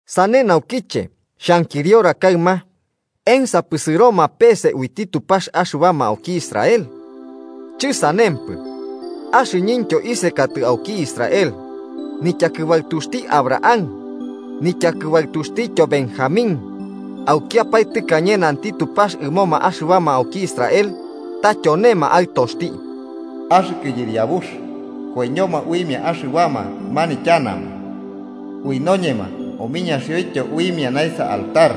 Sane naukiche xhankiriora kaɨma: ¿Ensapɨ sɨroma pese uiti Tupax axɨbama auki Israel? ¡Chɨsanempɨ! Axɨñɨntyo isekatɨ auki Israel. Nityakɨbaɨtuxti Abraham nityakɨbaɨtuxtityo Benjamín. Aukiapae tɨkañe nanti Tupax ɨmoma axɨbama auki Israel, ta tyonema aɨtoxti. “Axɨkɨ Yɨriabux, koiñoma uimia axɨbama manityanama ui noñema omiñaxioityo uimia naesa altar.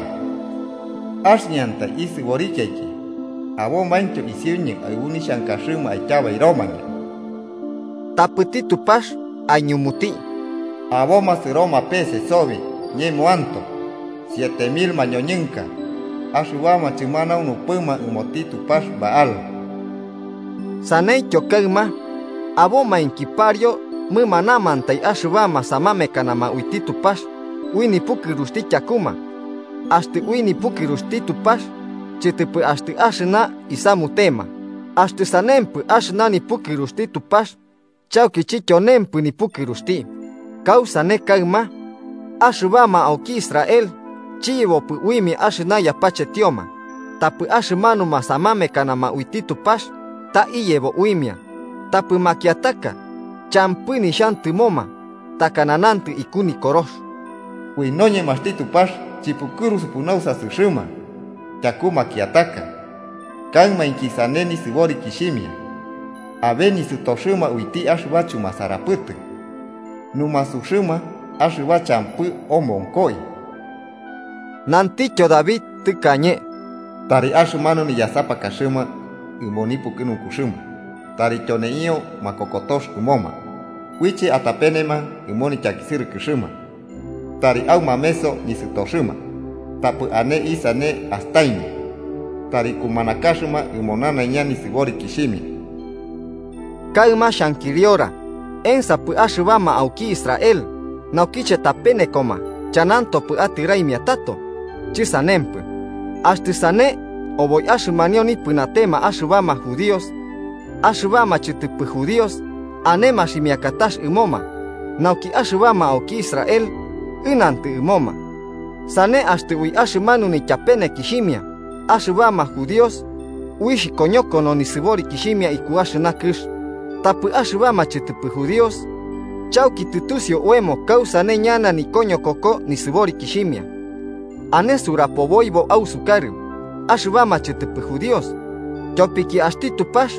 Axɨñantai isɨborikiaiki, abomaintyo isiuñɨ aɨbu nixhankaxɨma aityabairomañɨ.” Tapɨti Tupax aiñumuti: “Aboma sɨroma pese sobi ñemoantoe siete mil mañoñɨnka axɨbama chɨmanaunupɨma ɨmoti tupax Baal.” Saneityo kaɨma abomainki pariu mɨmanamantai axɨbama samamekanama uiti Tupax ui nipukɨruxti tyakuma. Axtɨ ui nipukɨruxti Tupax, chɨtɨpɨ axtɨ axɨna isamutema. Axtɨ sanempɨ, axɨna nipukɨruxti Tupax chauki chityonempɨ nipukɨruxti. ¿Kausane kaɨma? Axɨbama auki Israel chiyebopɨ uimia axɨna yapachetioma, tapɨ axɨmanuma samamekanama uiti Tupax ta iyebo uimia. Tapɨ makiataka champɨ nixhantɨmoma, takana nantɨ iku Nikorox: “Ui noñemaxti Tupax chɨpukɨrusupɨ nausasɨxɨma tyaku makiataka, kaɨmainki sane nisɨborikixhimia. Abe nisɨtoxɨma uiti axɨba chumasarapɨtɨ numasuxɨma axɨba champɨ omonkoi.” Nantityo David tɨkañe: “Tari axɨmanu niyasapakaxɨma ɨmo nipukɨnunkuxɨma tari tyoneio makokotox ɨmoma, uiche atapenema ɨmo nityakisɨrɨkɨxɨma. Tari aumameso nisɨtoxɨma, tapɨ ane isane astaimia. Tari kumanakaxɨma ɨmo nanaiña nisɨborikixhimia.” Kaɨma xhankiriora: ¿Ensapɨ axɨbama auki Israel, naukiche tapenekoma, chanantopɨ atɨraimia tato? ¡Chɨsanempɨ! Axtɨ sane, oboi axɨmanio nipɨnatema axɨbama judíos, axɨbama chɨtɨpɨ judíos ane maximiakatax ɨmoma, nauki axɨbama auki Israel ɨnantɨ ɨmoma. Sane, axtɨ ui axɨmanu nityapenekixhimia axɨbama judíos uixh koñokono nisɨborikixhimia iku axɨna kɨx, tapɨ axɨbama chɨtɨpɨ judíos, ¡chauki tɨtusiu oemo kausane ñana nikoñokoko nisɨborikixhimia! Ane surapoboibo ausukarɨ, axɨbama chɨtɨpɨ judíos. Tyopiki axti Tupax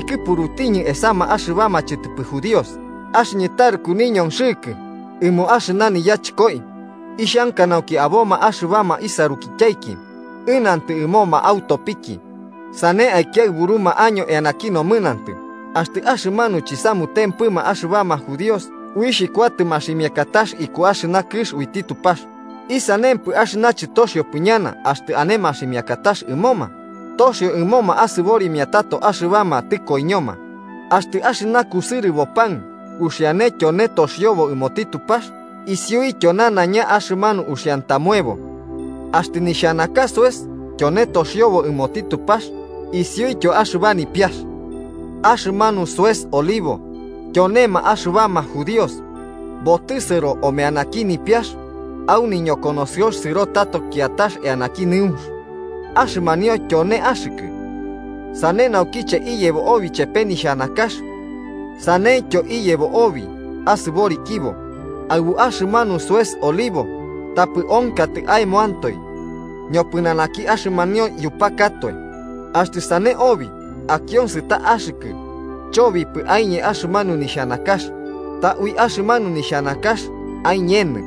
ikɨpurutiñɨ esama axɨbama chɨtɨpɨ judíos, axɨñɨ taruku niñonxɨkɨ ɨmo axɨna niyachɨkoi. Ixhanka nauki aboma axɨbama isarukityaiki ɨnantɨ ɨmoma autopiki, sane aikiaɨburuma año eanaki nomɨnantɨ. Axtɨ axɨmanu chiyasutiupɨma axɨbama judíos, uixh kuatɨ maximiakatax iku axɨna kɨx uiti Tupax, ¿isanempɨ axɨna chɨtoxiopɨ ñana axtɨ ane maximiakatax ɨmoma? ¡Toxio ɨmoma asɨborimia tato axɨbama tɨkoiñoma! Axtɨ axɨna kusɨrɨbo pan uxiane tyone toxiobo ɨmoti Tupax, isiuityo nanaiña axɨmanu uxiantamoebo. Axtɨ nixhanaka soes tyone toxiobo ɨmoti Tupax, isiuityo axɨba nipiax. Axɨmanu soes olivo, tyonema axɨbama judíos, botɨsɨro omeanaki nipiax, au niñokonosɨox sɨro tato kiatax eanaki nɨunx, axɨmanio tyone axɨkɨ. Sane naukiche iyebo obi chepe nixhanakax saneityo iyebo obi asɨborikibo aɨbu axɨmanu soes olivo. Tapɨ onkatɨ aemoantoe, ñopɨnanaki axɨmanio yupakatoe. Axtɨ sane obi akionsɨ ta axɨkɨ chobipɨ aiñe axɨmanu nixhanakax, ta ui axɨmanu nixhanakax aiñenɨ.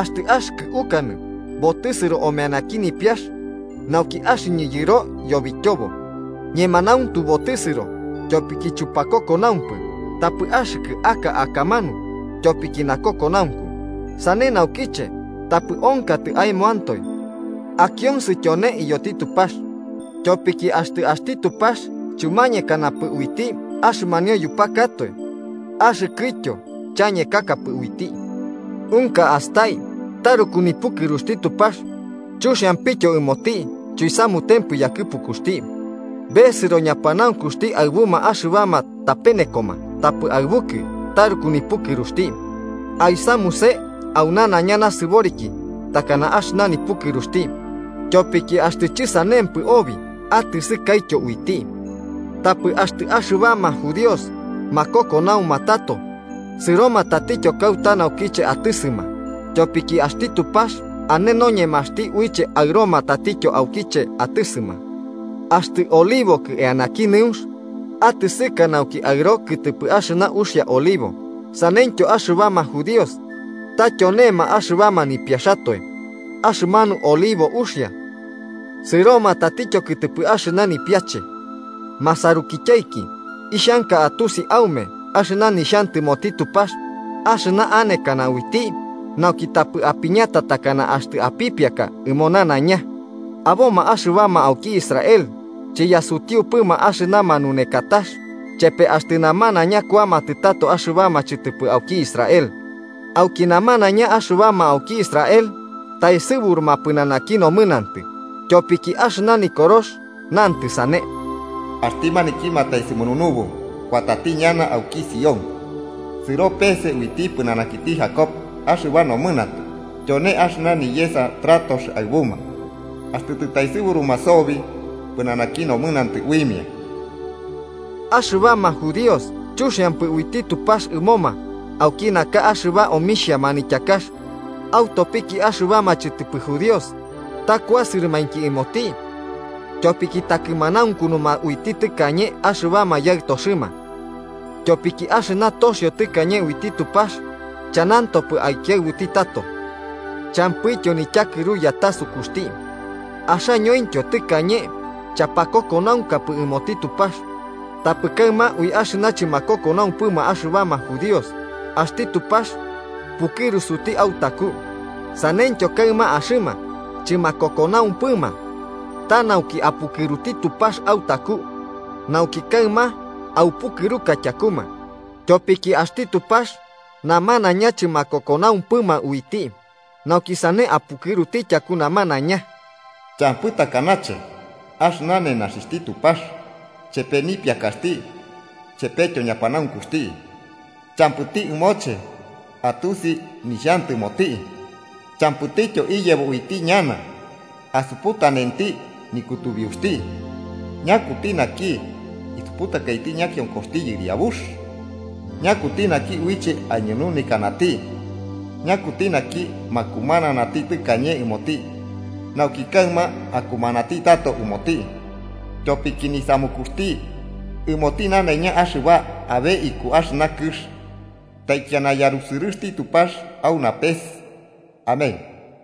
Axtɨ axɨkɨ ukanɨ: “Botɨsɨro omeanaki nipiax nauki axɨñɨ yɨro yobityobo.” Ñemanauntu, botɨsɨro tyopiki chupakokonaumpɨ, tapɨ axɨkɨ aka akamanu tyopiki nakokonaunku. Sane naukiche tapɨ onkatɨ aemoantoe, akionsɨ tyone iyoti Tupax. Tyopiki axtɨ axti Tupax chumañekanapɨ uiti axɨmanio yupakatoe, axɨkɨtyo chañekakapɨ uiti. Unka astai taruku nipukɨruxti Tupax, chuxiampityo ɨmoti chuisamutempɨ yakɨpukuxti. Besɨro ñapanaunkuxti aɨbuma axɨbama tapenekoma, tapɨ aɨbukɨ taruku nipukɨruxti. Aisamuse au nanaiña nasɨboriki takana axɨna nipukɨruxti. Tyopiki axtɨ chɨsanempɨ obi atɨsɨkaityo uiti. Tapɨ axtɨ axɨbama judíos makokonauma tato, sɨroma tatityo kauta naukiche atɨsɨma. Tyopiki axti Tupax ane noñemaxti uiche aɨroma tatityo aukiche atɨsɨma. Axtɨ olivokɨ eanaki nɨunx atɨsɨka nauki aɨro kɨtɨpɨ axɨna uxia olivo, ¡saneityo axɨbama judíos ta tyonema axɨbama nipiaxatoe axɨmanu olivo uxia, sɨroma tatityo kɨtɨpɨ axɨna nipiache! Masarukityaiki, ixhanka atusi aume nixhantɨmoti Tupax axɨna anekana uiti, nauki tapɨ apiñata takana axtɨ apipiaka ɨmo nanaiña: aboma axɨbama auki Israel chiyasutiupɨma axɨna manunekatax chepe axtɨ namanaiña kuamatɨ tato axɨbama chɨtɨpɨ auki Israel. Auki ñamanaiña axɨbama auki Israel taesɨburuma pɨnanaki nomɨnantɨ, tyopiki axɨna Nikorox nantɨ sane: “Axti naki mataesɨmununubu kuatati ñana auki Sión sɨro pese uiti pɨnanakiti Jacob axɨba nomɨnantɨ. Tyone axɨna niyesa tratox aɨbuma axtɨ tɨtaesɨburuma sobi pɨnanaki nomɨnantɨ uimia.” Axɨbama judíos chuxiampɨ uiti Tupax ɨmoma auki naka axɨba omixhia manityakax, autopiki axɨbama chɨtɨpɨ judíos. Ta kuasɨrɨmainki ɨmoti tyopiki takɨmanaunkunuma uiti tɨkañe axɨbama yaɨtoxɨma. Tyopiki axɨna toxio tɨkañe uiti Tupax chanantopɨ aikiaɨbuti tato, champɨityo nityakɨru yatasukuxti. Axañointyo tɨkañe chapakokonaunkapɨ ɨmoti Tupax, tapɨ kaɨma ui axɨna chɨmakokonaumpɨma axɨbama judíos, axti Tupax pukɨrusuti autaku. Saneityo kaɨma, axɨma chɨmakokonaumpɨma, ta nauki apukɨruti Tupax autaku, nauki kaɨma aupukɨruka tyakuma. Tyopiki axti Tupax namanaiña chɨmakokonaumpɨma uiti, nauki sane apukɨruti tyaku namanaiña. ¡Champɨ takanache axɨna nenaxixhti Tupax, chepe nipiakaxti chepetyo ñapanaunkuxti! Champɨti ɨmoche atusi nixhantɨmoti, champɨtityo iyebo uiti ñana asuputanenti nikutubiuxti. “¿Ñakuti naki isuputakaiti ñakionkoxti Yɨriabux? ¿Ñakuti naki uiche aiñununekanati? ¿Ñakuti naki makumananati tɨkañe ɨmoti, nauki kaɨma akumanati tato ɨmoti?” Tyopiki nisamukuxti, ɨmoti nanaiña axɨba abe iku axɨna kɨx. ¡Taikiana yarusɨrɨxti Tupax au napes! Amén.